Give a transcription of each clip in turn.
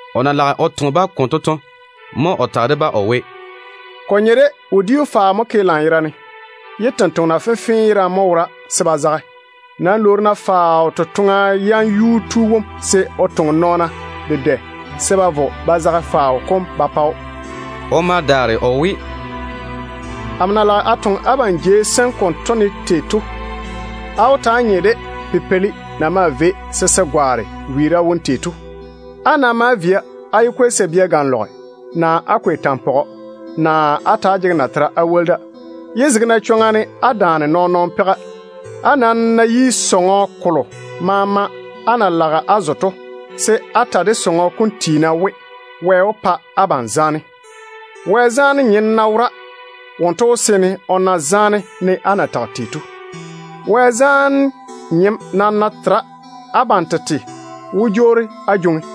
O na lage o toŋe-ba konto to, mo o tage de-ba o we, “Ko nye de wodiu faao mo ke lanyerane, ye tontoŋena fenfee yerane mo wora se ba zage. Nam lwoori-na faao totoŋa yam yuu tu wom se o toŋe nɔɔna dedɛ se ba vo ba zage faao kom ba pa‑o.” O ma daare o we, “Amo na lage a toŋe abam jei sem konto ne to, á wó taa nye de pipeili na maa vei se se gwaane wiira wone tei to. Á ná maa via, á yé kwei sabia ganlɔgere, naa á kwei tampɔgɔ, naa á ta‑á jege natera á woli da. Yé zege-na chwoŋa ne á daane nɔɔn-nɔɔno peiga. Á nam ná yi sɔŋɔ kolo maama á na lage á zo to, se á ta de sɔŋɔ kom tiina we, ‘Wɛ wó pa abam zaane.’ Wɛ zaane nyem ná wora, wonto wó seene o na zaane ne á na tage tei to. Wɛ zaane nyem nam ná tera, abam tete mo wó jwoori á jwoŋi.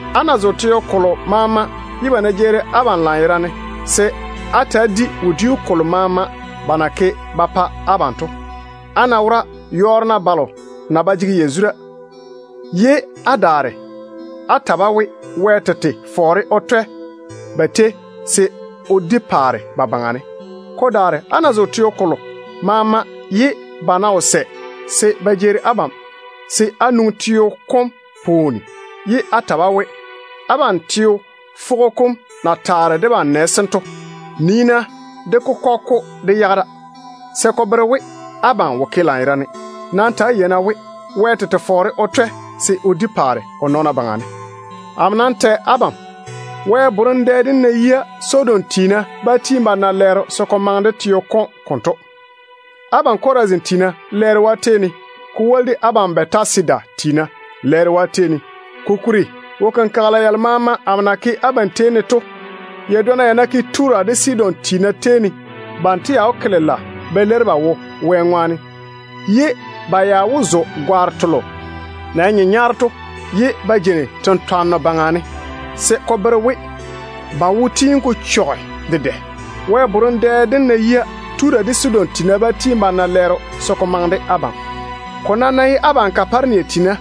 Á ná zo teo kolo maama ye ba ná jeeri abam lanyerane, se á ta‑á di wodiu kolo maama ba na ke ba pa abam to. Á ná wora, yɔɔre-na balo na ba jege yazura, ye á daare á ta-ba we, Wɛ tete fɔɔre o twɛ ba tei se o di paare ba baŋa ne. Ko daare, á ná zo teo kolo maama ye ba ná wo sɛ se ba jeeri abam, se á nwoŋi teo kom pwooni ye á ta-ba we, ‘Abam teo fwogo kom na taare debam nɛ sem to, nii-na dé kokɔge-ko dé yage da, se ko bere we abam wo ke lanyerane. Nam ta‑á yei-na we, Wɛ tete fɔɔre o twɛ se o di paare o nɔɔna baŋa ne.’ Amo nam tɛ abam we, Wɛ borem dɛ dem ná yia, Sodom tiina bá tiini ba na lɛɛro se ko maŋe de teo kom konto. Abam Chorazin tiina, lɛɛro yi abam! Ko woli de abam Bɛtasida tiina, lɛɛro yi abam! Kokuri, wo-kenkagela yalo maama amo na ke abam tetare ne to, ya dwonna ya ná ke Tura de Sidon tiina tei ne, banto ya wó ke lela ba leiri ba wo Wɛ ŋwaane. Ba maa wó zo gare-nyenyaaro ye ba jei tentwarem wone ba wo-chechɔgɔ kom ŋwaane. Wɛ borem dɛ dem ná yia, Tura de Sidon tiina bá tiini ba na lɛɛro se ko maŋe de abam. Ko nam ná ye abam Kaparenia tiina,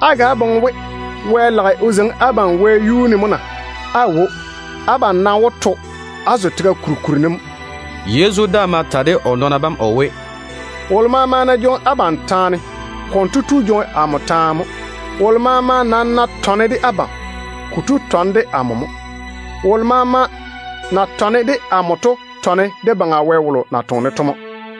á ga boŋe we Wɛ lage o zeiŋi abam wɛyuu ne mo na? Aawo. Abam nam wó to á zo tega kuri kuri ne mo.” Yezu daa ma ta de o nɔɔna bam o we, “Wolo maama ná jwoŋi abam taane, konto tu jwoŋi amo taane mo. Wolo maama nam ná tɔne de abam, kotu tɔne de amo mo. Wolo maama na tɔne de amo to tɔne de Baŋa Wɛ wolo na toŋe-ne to mo.”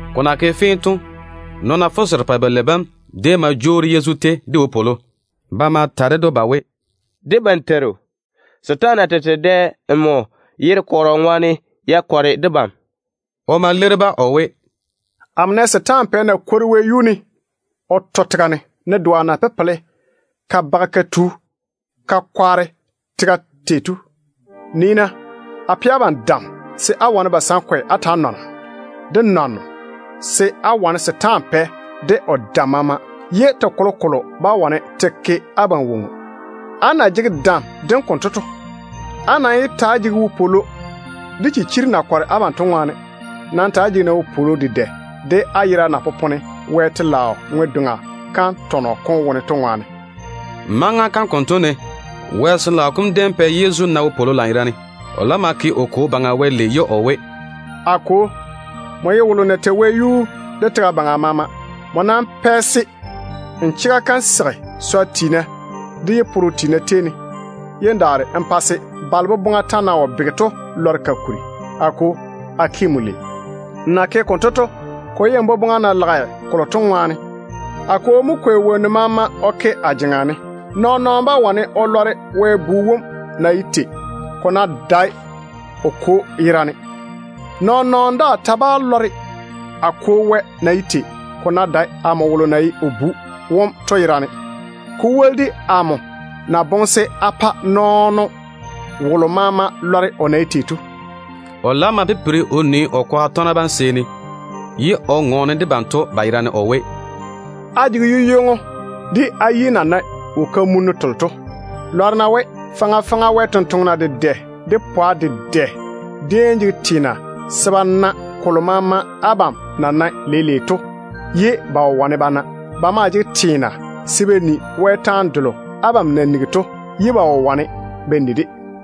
Ko na ke fee to, nɔɔna fuserepɛ-balei bam déem ma jwoori Yezu tei de wopwolo. Ba ma ta ded‑o ba we, “Debam Teiru, setaana tete dɛ nmo yere kɔrɔ ŋwaane ya sɛ ya pa debam.” O ma leiri-ba o we, “Amo nɛ setaana pɛ na kwori wɛyuu ne o to tega ne, ne doa na pepela ka baga ka tu ka kwaare tega tei to. Nii-na, a pɛ abam dam se á wane basankwe á taa nɔna, de nwanno, se á wane setaana pɛ de o dam maama, ye te kolokolo bá wane te ke abam woŋo. Á na jege dam dem konto to, á nam yé ta‑á jege wopwolo de chichiri na kɔre abam to ŋwaane. Nam ta‑á jege-na wopwolo dedɛ de á yera na popone Wɛ telaao ŋwe-doŋa tɔnɔ kom wone to.” Maŋa kam konto ne, Wɛ Sin-laao kom déem pɛ Yezu di ywoni lanyerane. O laam ma ke o Kwo Baŋa Wɛ lei ye o we, “A Kwo, nmo ye wolo na tei wɛyuu de tega baŋa maama. Nmo nam pɛ se n chega kam seigi swa tiina de yi-pore-nyena tei ne, ye n daare n pa se balo boboŋa ta na wo bege to lɔre ka kuri. A Kwo, a ke nmo lei. Nmo na ke konto to, ko ye n boboŋa na lage kolo to ŋwaane. A Kwo mo kwei wonnu maama o ke a jeŋa ne. Nɔɔn-nɔɔno bá wane o lɔre Wɛ Bu wom na ye tei, ko ná dae o Kwo yerane. Nɔɔn-nɔɔno daa ta bá lɔre a Kwo Wɛ na ye tei, ko ná dae amo wolo na ye o Bu wom to yerane, ko woli de amo na boŋe se a pa nɔɔno wolo maama lɔre o na ye tei to.” Yezu laam ma pipiri o nii o kwaga tɔgena bam seeni, ye o ŋɔɔne de banto ba yerane o we, “Á jege yu-ywoŋo de á yi na nae wo-kamunnu telo to. Lɔre-na we, faŋa faŋa Wɛ sampwori dedɛ, de pwa dedɛ déem jege teena se ba na kolo maama abam na nae leile to, ye ba wo wane ba na. Ba maa jege teena se ba ni Wɛ taane delo abam na nigi to, ye ba wo wane ba ni-de.”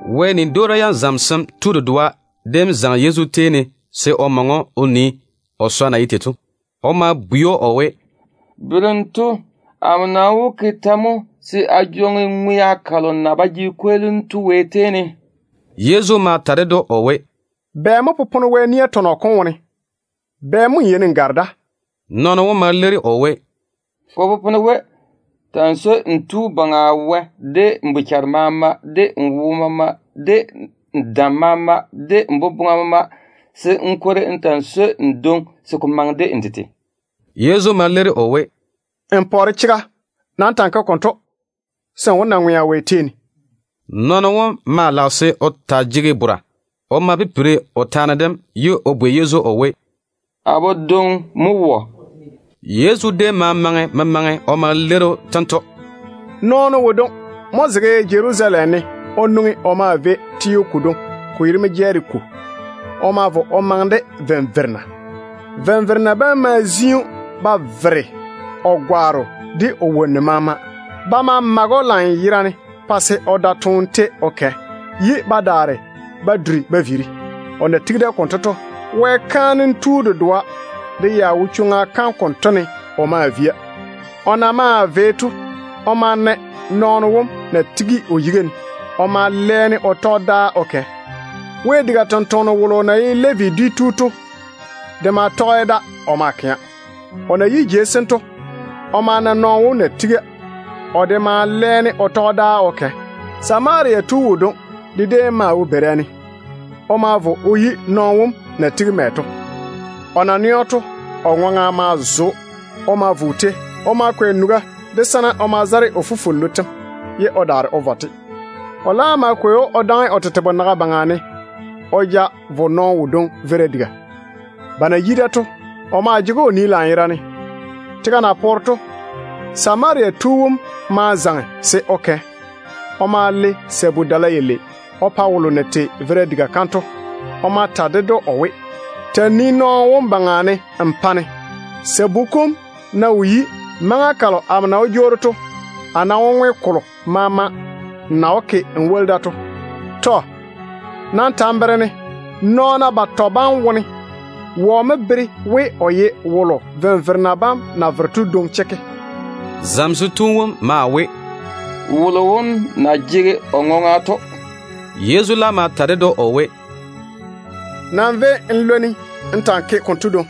Wɛ nia yam zamesem tu dedoa déem zaŋe Yezu tei ne se o maŋe‑o o nii o swa na ye tei. O ma bwei‑o o we, “Berem tu, amo nam wó ke tɛ mo se a jwoŋi ŋwea kalo na ba jege kweelim Wɛ tei ne to?” Yezu ma ta ded‑o o we, “Bɛ mo popone Wɛ nia tɔnɔ kom wone? Bɛ mo n yeini n gare da?” Nɔɔno wom ma leiri o we, “Ko popone we, ta‑n swoi n Tu Baŋa Wɛ de n bochare maama, de n wo maama, de n dam maama, de n boboŋa maama, se n kwori n ta‑n swoi n dwoŋi se ko maŋe de n tete.” Yezu ma leiri o we, “N pɔɔre chega. Nam ta‑n ke konto, se n wó na ŋwea Wɛ tei ne.” Nɔɔno wom maa lage se o taa jege bora. O ma pipiri o taane dem, ye o bwei Yezu o we, “Amo dwoŋi mo wɔ?” Yezu déem ma maŋe memaŋe o ma leiri‑o tento: “Nɔɔno wodwoŋi mo zege Jerusalem teo ne o nwoŋi o maa vei Jeriko. O ma vo o maŋe de venverena. Venverena bam ma zi‑o ba vere o gwaaro de o wonnu maama. Ba ma mage‑o lanyerane pa se o da toone tei o kɛ, ye ba daare ba duri ba viiri. O na tigi da konto to, Wɛ kaanem tu dedoa de ya wo chwoŋa kam konto ne o maa via. O na maa vei to, o ma na nɔɔno wom na tigi o yiga ne. O ma lɛɛne o tɔge dáa o kɛ. Wɛ diga tontoŋeno wolo na ye Levi dwi tu to de maa tɔge da o maa kɛa. O na yi jei sem to, o ma na nɔɔno wom na tiga. O de daa ma lɛɛne o tɔge dáa o kɛ. Samaria tu wodwoŋi de déem maa wo beira ne. O ma vo o yi nɔɔno wom na tigi mɛ to. O na nɛ‑o to, o ma duri o ŋwaŋa. O ma vo o tei. O ma kwei nuga de sana o ma zare o fufwollu tem, ye o daare o vɔ-te. O laam ma kwei‑o o daŋe o tete bonaga baŋa ne o ja vo nɔɔno wodwoŋi veira diga. Ba na yi da to, o maa jege‑o o nii lanyerane. Tega na poore to, Samaria tu wom ma zaŋe se o kɛ. O ma le lu-nyenno sabu-dala yalei o pa wolo na tei veira diga kam to. O ma ta ded‑o o we, ‘Ta‑n nii nɔɔno wom baŋa ne n pa-ne. Sabu kom ná wo yi, maŋa kalo amo na wó jwoori to a nam wó ŋwe kolo maama n na wó ke n woli da to.’ Tɔ. Nam ta n bere-ne, nɔɔna batɔ bam wone wɔ mo bere we o ye wolo venverena bam na vere to dwoŋi chekke?” Zamesem tu wom maa we, “Wolo wom na jege o ŋwaŋa to.” Yezu laam ma ta ded‑o o we, “Nam véi n lwoni n ta‑n ke konto dwoŋi.”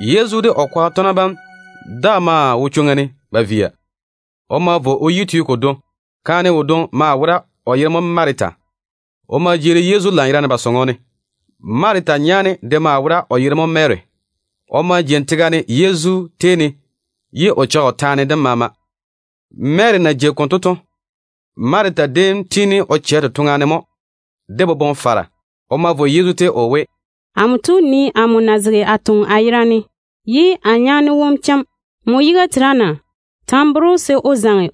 Yezu de o kwaga tɔgena bam daa maa wo chwoŋa ne ba via. O ma vo o yi teo kodwoŋi. Kaane wodwoŋi maa wora, o yere mo Marita. O ma jeeri Yezu lanyerane ba sɔŋɔ ne. Marita nyaane de maa wora, o yere mo Mary. O ma jeini tega ne Yezu tei ne, ye o cheigi o taane dem maama. Mary na jei konto to, Marita déem tiini o chɛ totoŋa ne mo de boboŋ-fara. O ma vo Yezu tei ye o we, “Amo tu, nii amo na zege a toŋa dedɛ a yerane, ye a nyaane wom chem. Nmo yiga tera na? Ta n bere‑o se o zaŋe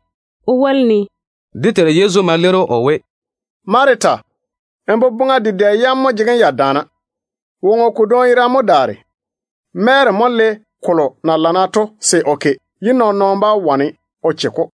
o woli-ne.” Dé Teiru Yezu ma leiri‑o o we, “Marita, n boboŋa dedɛ yam mo jege‑m ya daana. Woŋo kodwoŋi yerane mo daare. Mary mo le kolo na lana to se o ke, ye nɔɔn-nɔɔno bá wane o che-ko.”